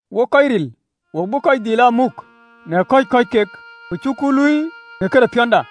Wok kɔc ril, wo bï kɔc dhil aa muk në kɔ̈c kɔ̈ɔ̈c kek, ku cuku ee luui në këde piɔ̈nda.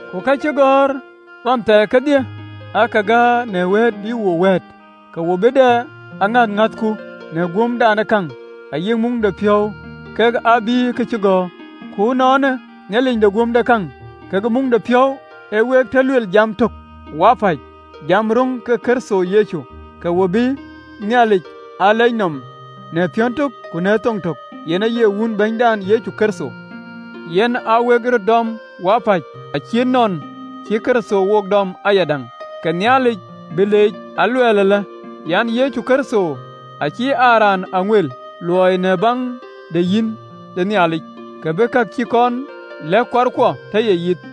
Ku ka cï gɔ̈ɔ̈r ɣɔn thɛɛr kedhie aake gäär ë wëët bï wo wëët, ke wo bï dɛ aŋäth ŋäthku në guömdekäŋ ayï muŋdepiɔ̈u kak ë bïïyë kacïgɔ̈ɔ̈r. Ku ënɔɔnë, Nhialic de guömdekäŋ kekë muŋdepiɔ̈u, ee week tɔ luel jam tök wapäc jam röŋ ke Kërtho, ke we bï Nhialic aa lɛc nɔm në piɔ̈n tök ku në thoŋ tök, yen aye Wun Bɛ̈nydan Yecu Kërtho. Yen aa wek röt dɔm wapäc, acït nɔn cï Kërtho wook dɔm ayadäŋ, ke Nhialic bï leec. Aluɛɛl alë an, Kërtho acï aa raan ë aŋueel luööi në baŋ de yic de Nhialic, ke bï ka cï kɔn lɛ̈k kuarkuɔ tɔ ye yith,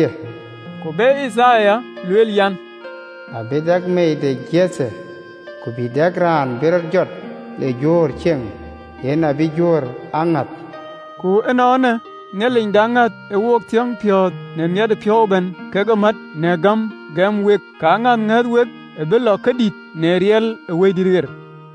(LXX). Ku be Yithaya luel an, “Abï dɛ meei de Jethe, Ku bï dɛ raan bï rɔt jɔ le Juöör cieŋ, Yen abï Juöör aa ŋɔ̈ɔ̈th.” Ku ënɔɔnë, Nhialic de aŋäth ë week thiɔ̈ɔ̈ŋ piɔ̈ɔ̈th në miɛtëpiɔ̈u ëbɛ̈n kekë mät në gäm gäm wek, ke aŋäth ŋäth wek abï lɔ ke dït, në riɛl ë Wëidït ɣer.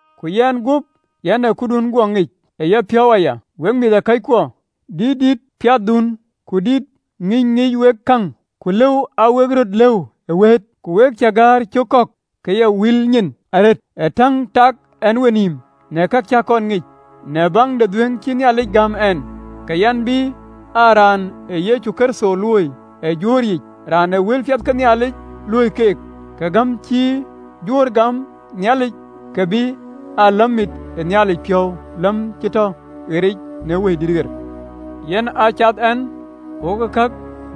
Ku yɛn guöp yɛn ë këdun guɔ ŋic ë yapiɔ̈u aya, wek mïthëkɔckuɔ, dït dïïtë piathdun, ku dït ë ŋïny ŋiɛc wek käŋ, ku lëu aa wek röt lëu ë wëët. Ku we cä gäär cök kɔ̈k ke ya ril nyin arëët, ë täŋ täk ɛn wenïïm në kë cäk kɔn ŋic, në baŋ de dhuëëŋ cï Nhialic gäm ɛn. Ke yɛn bï aa raan ë Yecu Kërtho luööi ë Juöör yiic, raan ë wëlpiɛth ke Nhialic luöi keek, ke gäm cï Juöör gäm Nhialic ke bï aa läm mit ë Nhialic piɔ̈u, läm cï tɔ piɛth në Wëidït ɣer. Yen a cath ɛn wokë kë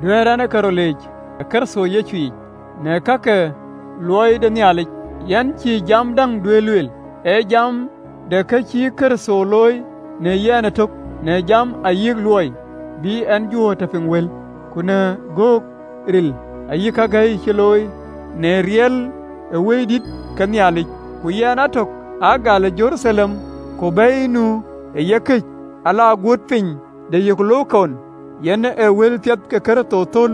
duɛ̈ɛ̈r ɛn rɔt leec ë Kërtho Yecu yic në ka ke luɔi de Nhialic. Yɛn cïï jam däŋ duɛ̈ɛ̈r lueel, ee jam de kë cï Kërtho looi në yɛn etök, në jam ayï luɔi, bï en Juöör tɔ piŋ wël, ku në göök ril ayï kake gäi cï looi, në riɛl ë Wëidït ɣer ke Nhialic, ku yɛn a tök, aa gal ë Jeruthalem ku bɛ̈i nu ë yekëc, ale guööt piny de Yilirikum, yɛn ë wëlpiɛth ke Kërtho thöl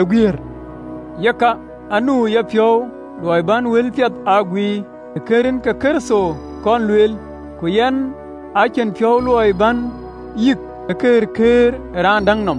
ë guiëër. Yeka, aa nu ë yapiɔ̈u luɔi bän wëlpiɛth aa guiir, të kënë rin ke Kërtho kɔn lueel, ku yɛn aa cïn piɔ̈u luɔi bän yïk ë këërkëër ë raan däŋ nɔm.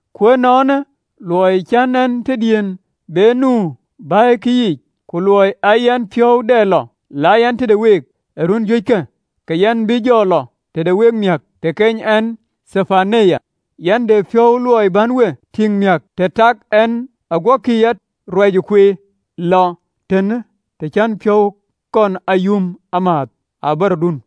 Ku ënɔɔnë luɔi cïn en tëdiën be nu ë bɛ̈ikë yiic, ku luɔi aa yɛn piɔ̈u dɛ lɔ la yɛn tëde week ee run juëckë, ke yɛn bï jɔ lɔ tëde week, miäk të keny ɛn Tarcic, (yɛn de piɔ̈u luɔi bän we tïŋ miäk të tɛ̈ɛ̈k ɛn, aguɔkï ya ruac kueer lɔ tɛ̈ɛ̈n, të cän piɔ̈u kɔn a yum ëmääth ë abärɔdun).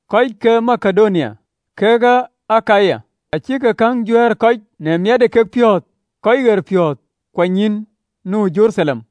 Kɔc ke Makedonia kekë Akaya acïk käŋ juɛ̈ɛ̈r kɔc në miɛt ë kekpiɔ̈ɔ̈th kɔc ɣerpiɔ̈ɔ̈th kuanynyïïn nu ë Jeruthalem.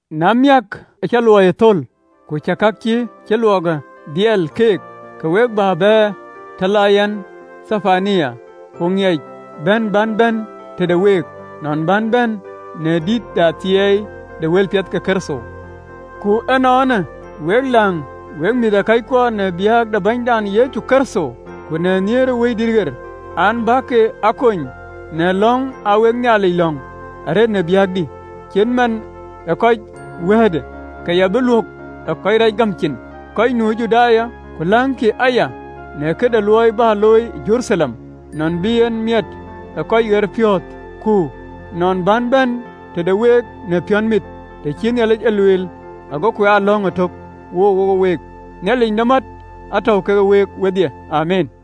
Na miäk, acä luɔiyë thöl, ku cä ka cï ke luöi ke dhiël keek, ke we bä baar të la yɛn Tarcic. Ku aŋiɛc bɛ̈n bän bɛ̈n tëde wek, nɔn bän bɛ̈n në dït de athiɛɛi de wëlpiɛth ke Kërtho. Ku ënɔɔnë, wek läŋ, wek mïthëkɔckuɔ, në biäk de Bɛ̈nydan Yecu Kërtho, ku nhiëër ë Wëidït an, bäk a kony në lɔ̈ŋ aa wek Nhialic lɔ̈ŋ arëët në biäkdï, cït man ë kɔc wiët, ke ya bï luök ë kɔc reec gäm cin, kɔc nu Judaya, ku läŋkï aya, në këde luɔi bä looi ë Jeruthalem, nɔn bï en miɛt tëde kɔc ɣerpiɔ̈ɔ̈th. Ku nɔn bän bɛ̈n tëde week në piɔ̈nmit, të cï Nhialic e lueel, agoku aa lɔ̈ŋ ëtök wokë week. Nhialic de mät, ë tɔ̈u ke week wedhie. Amiin.